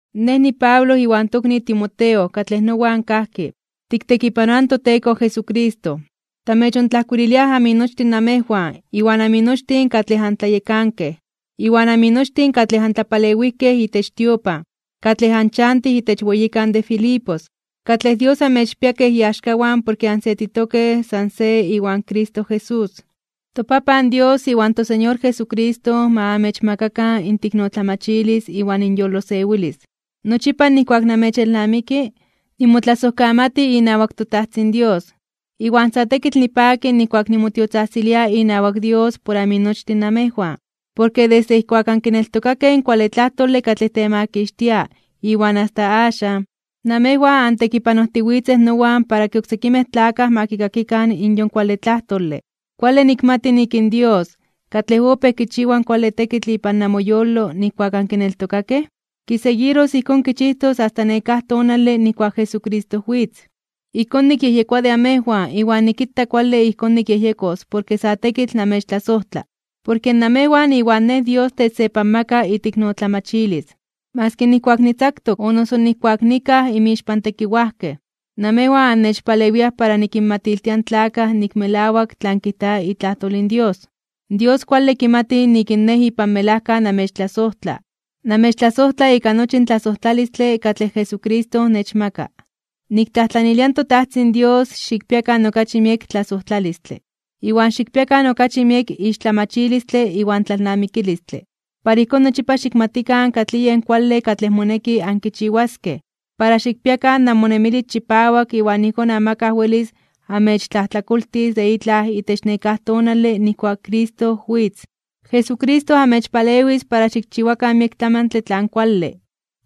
Nej niPablo iwan tokni Timoteo katlej nowan kajki, tiktekipanoaj in toTeko Jesucristo. Tamechontlajkuililiaj aminochtin namejwan, iwan aminochtin katlej antlayekankej, iwan aminochtin katlej antlapalewijkej itech tiopan, katlej anchantij itech weyikan de Filipos, katlej Dios amechpia kej iaxkawan porke ansetitokej san se iwan Cristo Jesús. ToPapan Dios iwan toSeñor Jesucristo ma amechmakakan inteiknotlamachilis iwan inyolosewilis. Nochipa nijkuak namechelnamiki, nimotlasojkamati inawak toTajtzin Dios. Iwan sa tekitl nipaki nijkuak nimotiotzajtzilia inawak Dios por aminochtin namejwan. Porke desde ijkuak ankineltokakej in kuale tlajtole katlej temakixtia iwan asta axan, namejwan antekipanojtiwitzej nowan para ke oksekimej tlakaj ma kikakikan in yon kuale tlajtole. Kuale nikmati nik in Dios, katlej opéj kichiwa kuale tekitl ipan namoyolo nijkuak ankineltokakej, kiseguiros ijkón kichijtos asta nekáj tonale nijkuak Jesucristo witz. Ijkón nikyejyekoa de amejwan iwan nikita kuale ijkón nikyejyejkos porke sa tekitl namechtlasojtla. Porke namejwan iwan nej Dios techsepanmaka iteiknotlamachilis. Maski nijkuak nitzaktok, o noso nijkuak nikaj inmixpan tekiwajkej, namejwan annechpalewiaj para nikinmatiltia in tlakaj nik melawak tlan kijta itlajtol in Dios. Dios kuale kimati nik in nej ipan melajka namechtlasojtla, namechtlasojtla ika nochi in tlasojtlalistle katlej Jesucristo nechmaka. Niktlajtlanilia in toTajtzin Dios xikpiakan okachi miek tlasojtlalistle, iwan xikpiakan okachi miek ixtlamachilistle iwan tlalnamikilistle. Para ijkón nochipa xikmatikan katlij yen kuale katlej moneki ankichiwaskej, para xikpiakan namonemilis chipawak iwan ijkón amakaj welis amechtlajtlakoltis de itlaj itech nekáj tonale nijkuak in Cristo witz. Jesucristo amechpalewis para xikchiwakan miek tlamantle tlan kuale.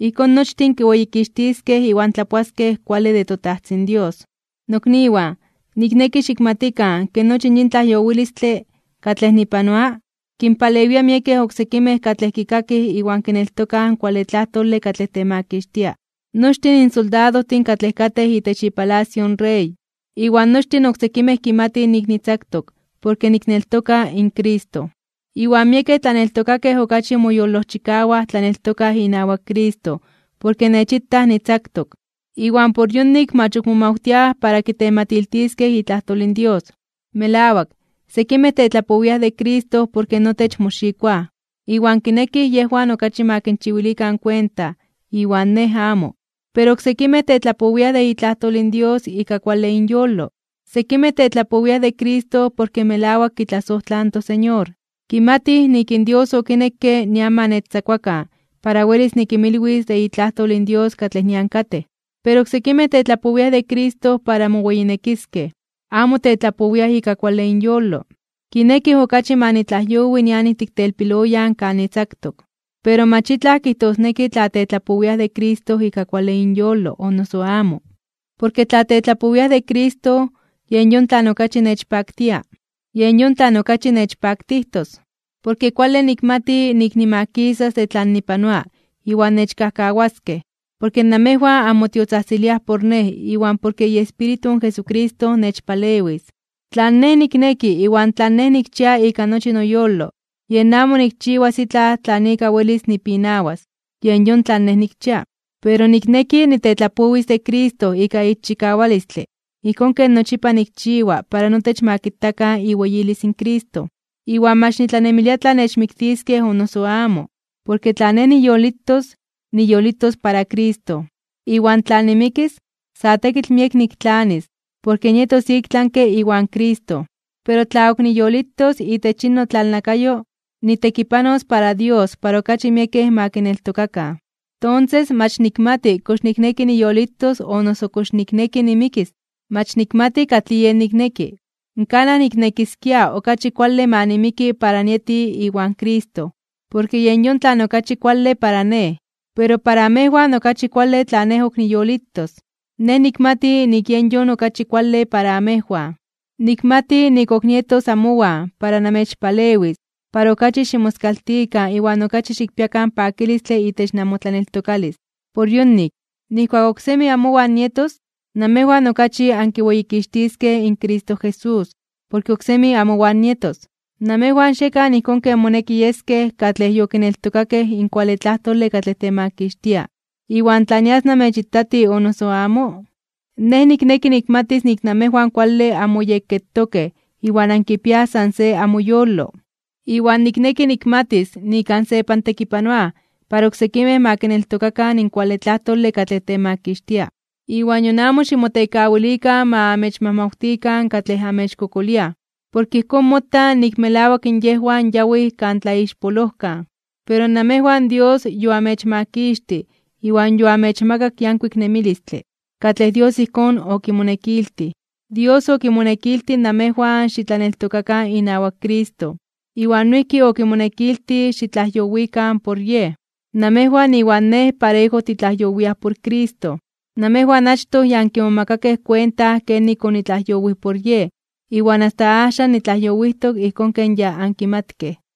Ijkón nochtin kiweyikixtiskej iwan tlapoaskej kuale de toTajtzin Dios. Nokniwan, nikneki xikmatikan ke nochi yin tlajyowilistle katlej nipanoa, kinpalewia miekej oksekimej katlej kikakij iwan kineltokaj in kuale tlajtole katlej temakixtia. Nochtin in soldadojtin katlej katej itech ipalacio in rey, iwan nochtin oksekimej kimatij nik nitzaktok porke nikneltoka in Cristo. Iwan miekej tlaneltokakej okachi moyolojchikawaj tlaneltokaj inawak Cristo porke nechitaj nitzaktok. Iwan por yonik mach ok momawtiaj para kitematiltiskej itlajtol in Dios. Melawak, sekimej tetlapowiaj de Cristo porke notech moxikoaj, iwan kinekij yejwan okachi ma kinchiwilikan kuenta iwan nej amo. Pero oksekimej tetlapowiaj de itlajtol in Dios ika kuale inyolo. Sekimej tetlapowiaj de Cristo porke melawak kitlasojtlaj in toSeñor, kimatij nik in Dios okinekke nian ma nechtzakuakan para welis nikinmilwis de itlajtol in Dios katlej nian katej. Pero oksekimej tetlapowiaj de Cristo para moweyinekiskej. Amo tetlapowia ika kuale inyolo. Kinekij okachi ma nitlajyowi nian ijtik telpiloyan kan nitzaktok. Pero mach itlaj kijtosneki tla tetlapowiaj de Cristo ika kuale inyolo o noso amo. Porke tla tetlapowiaj de Cristo, yen yon tlan okachi nechpaktia. Yen yon tlan okachi nechpaktijtos. Porke kuale nikmati nik nimakisas de tlan nipanoa iwan nechkajkawaskej, porke namejwan anmotiotzajtziliaj por nej iwan porke iEspíritu in Jesucristo nechpalewis. Tlan nej nikneki iwan tlan nej nikchia ika nochi noyolo yen amo nikchiwas itlaj tlan ika welis nipinawas. Yen yon tlan nej nikchia. Pero nikneki nitetlapowis de Cristo ika ixchikawalistle ijkón ken nochipa nikchiwa para notech ma kitakan iweyilis in Cristo, iwan mach nitlanemilia tla nechmiktiskej o noso amo. Porke tla nej niyolitos, niyolitos para Cristo. Iwan tla nimikis, sa tekitl miek niktlanis, porke nietos iktlanke (ik tlami) iwan Cristo. Pero tla ok niyolitos itech yin notlalnakayo, nitekipanos para Dios para okachi miekej ma kineltokakan. Tonses mach nikmati kox nikneki niyolitos o noso kox nikneki nimikis. Mach nikmati katlij yen nikneki. Kanaj niknekiskia okachi kuale ma nimiki para nieti iwan Cristo, porke yen yon tlan okachi kuale para nej. Pero para amejwan okachi kuale tla nej ok niyolitos. Nej nikmati nik yen yon okachi kuale para amejwan. Nikmati nik ok nietos amowan para namechpalewis para okachi ximoskaltikan iwan okachi xikpiakan pakilistle itech namotlaneltokalis. Por yonik, nijkuak oksemi amowan nietos, namejwan okachi ankiweyikixtiskej in Cristo Jesús, porke oksemi amowan nietos. Namejwan xiekan ijkón ken moneki yeskej katlej yokineltokakej in kuale tlajtole katlej temakixtia. Iwan tla nias namechitati o noso amo, nej nikneki nikmatis nik namejwan kuale anmoyekketokej iwan ankipiaj san se amoyolo. Iwan nikneki nikmatis nik ansepantekipanoaj para oksekimej ma kineltokakan in kuale tlajtole katlej temakixtia. Iwan nion amo ximotekawilikan ma amechmajmawtikan katlej amechkokoliaj. Porke ijkón mota nik melawak yejwan yawij kan tlaixpolojkan, pero namejwan Dios yoamechmakixtij iwan yoamechmakak yankuik nemilistle, katlej Dios ijkón okimonekiltij. Dios okimonekiltij namejwan xitlaneltokakan inawak Cristo, iwan noijki okimonekiltij xitlajyowikan por Yej. Namejwan iwan nej parejo titlajyowiaj por Cristo. Namejwan achtoj ya ankimomakakej kuenta kenik onitlajyowij por Yej. Iwan asta axan nitlajyowijtok ijkón ken ya ankimatkej.